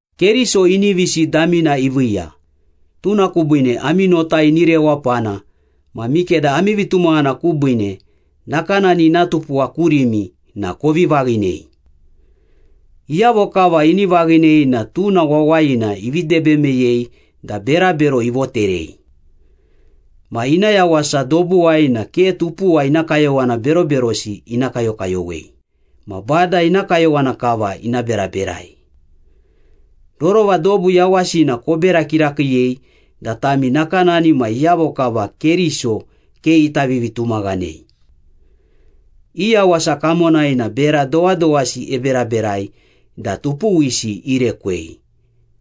Keriso inivisi damina iviiya, tuna kubiine ami nota ini rewapana ma mikeda ami vitumaghana kubiine nakanani ina tupuwa kurimi na kovi vaghinei. Iyavo kava ini vaghinei na tuna wawayina ivi debe meyei da berabero ivoterei. Ma ina yawasa dobuwai na ke tupuwa ina kayowana beroberosi ina kayokayowei, ma Bada ina kayowana kava ina beraberai. Rorova dobu yawasina kobera kirakiiyei da tami nakanani ma iyavo kava Keriso ke ita vivitumaghanei. I yawasa kamonai na bera dowadowasi eberaberai da tupuwisi irekwei,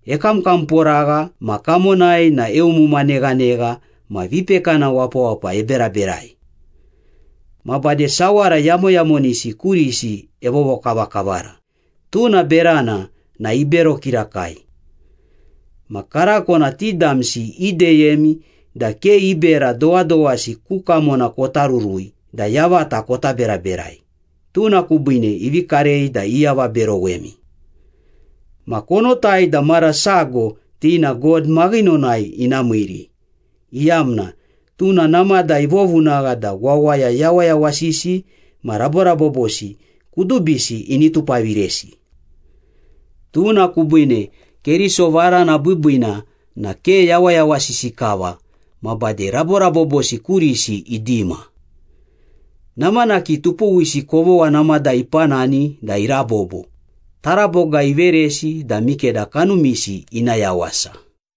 ekamkamporagha ma kamonai na eumuma neghanegha ma vipekana wapawapa eberaberai. Ma bade sawara yamoyamonisi kurisi evovokavakavara, tuna berana na ibero kirakai. Ma karako na ti damsi ideyemi da ke i bera dowadowasi ku kamona kota rurui da yavata kota beraberai, tuna kubiine ivi karei da iavaberowemi. Ma konotai da mara sago ti na God maghinonai ina miiri, iyamna tuna namada ivovunagha da wawaya yawayawasisi ma raborabobosi kudubisi ini tupaviresi. Tuna kubiine Keriso varana biibiina na ke yawayawasisi kava ma bade raborabobosi kurisi idima. Namanaki tupuwisi kovogha namada ipanani da irabobo, taraboga iveresi da mikeda kanumisi ina yawasa.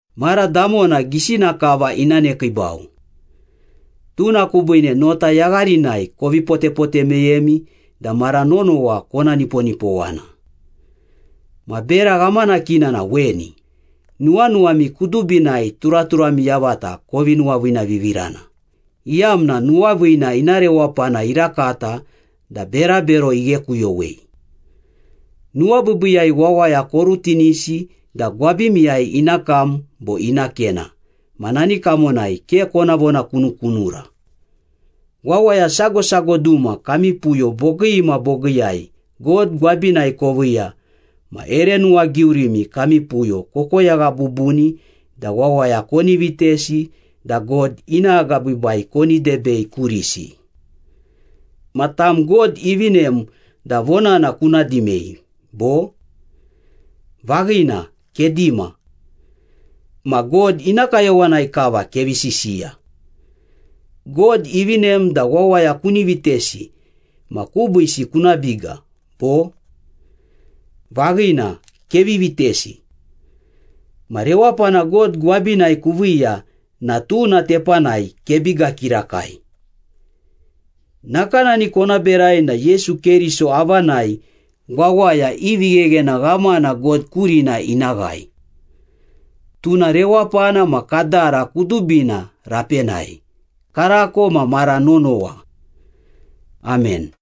Mara damona gisina kava ina nekiibau. Tuna kubiine nota yagharinai kovi potepote meyemi da mara nonowa kona niponipowana. Ma bera ghamanakina na weni, nuwanuwami kudubinai turaturami yavata kovi nuwaviinavivirana, iyamna nuwaviina ina rewapana irakata da berabero ighekuyowei. Nuwabiibiiyai wawaya korutinisi da gwabimiyai ina kam bo ina kena ma nani kamonai ke kona vonakunukunura. Wawaya sago sago duma kami puyo bogii ma bogiiyai God gwabinai koviiya ma ere nuwagiurimi kami puyo kokoyagha bubuni da wawaya koni vitesi da God ina agabiibai koni debei kurisi. Ma tam God ivinem da vonana kuna dimei, bo? Vaghina, kedima. Ma God ina kayowanai kava kevi sisiya. God ivinem da wawaya kuni vitesi ma kubiisi kuna biga, bo? Vaghina, kevi vitesi. Ma rewapana God gwabinai kuviiya na tuna tepanai kebiga kirakai. Nakanani kona berai na Yesu Keriso avanai wawaya i vigheghena ghamana God kurina ina ghae. Tuna rewapana ma kadara kudubina rapenai, karako ma mara nonowa. Amen.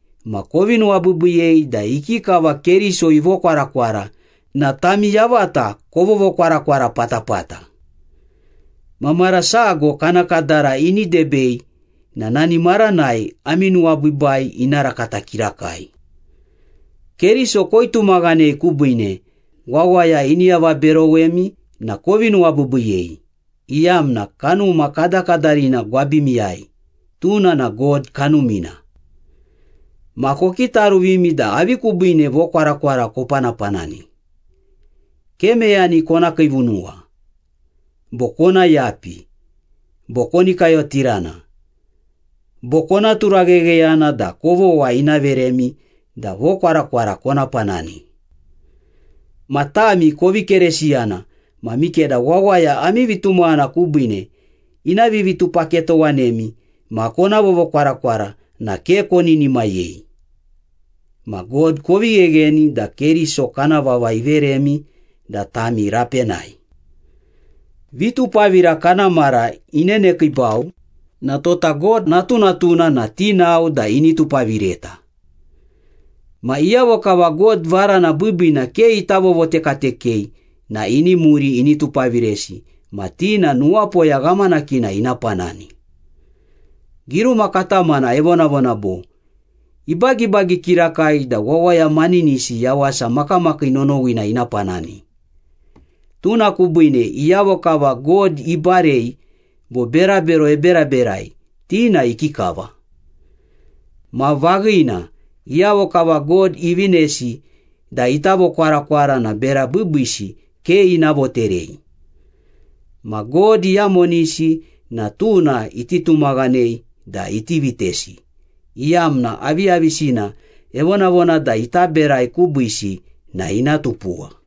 ma kovi nuwabiibiiyei da ikikava Keriso ivokwarakwara na tami yavata kovovokwarakwara patapata. Ma mara sago kana kadara ini debei na nani maranai ami nuwabiibai ina rakata kirakai. Keriso koitumaghanei kubiine, wawaya ini avaberowemi na kovi nuwabiibiiyei, iyamna Kanuma kadakadarina gwabimiyai, tuna na God Kanumina. Ma kokitaruvimi da avi kubiine vokwarakwara kopanapanani. Ke meyani kona kiivunuwa, bo kona yapi, bo koni kayotirana, bo kona turaghegheyana da kovogha ina veremi da vokwarakwara kona panani. Ma tami kovi Keresiyana ma mikeda wawaya ami vitumaghana kubiine ina vivitupaketowanemi ma kona vovokwarakwara na ke koninimayei. Ma God kovi ghegheni da Keriso kana vava iveremi da tami rapenai. Vitupavira kana mara inenekiibau na tota God natunatuna na tinao da ini tupavireta. Ma iyavo kava God varana biibiina ke ita vovotekatekei na ini muri ini tupaviresi ma ti na nuwapoya ghamanakina ina panani. Giruma katamana evonavona bo, “Ibagibagi kirakai da wawaya maninisi yawasa makamakii nonowina ina panani, tuna kubiine iyavo kava God ibarei bo berabero eberaberai, ti na ikikava?” Ma vaghina, iyavo kava God ivinesi da ita vokwarakwara na bera biibiisi ke ina voterei. Ma God iyamonisi na tuna iti tumaghanei da iti vitesi, iyamna aviyavisina evonavona da ita berai kubiisi na ina tupuwa.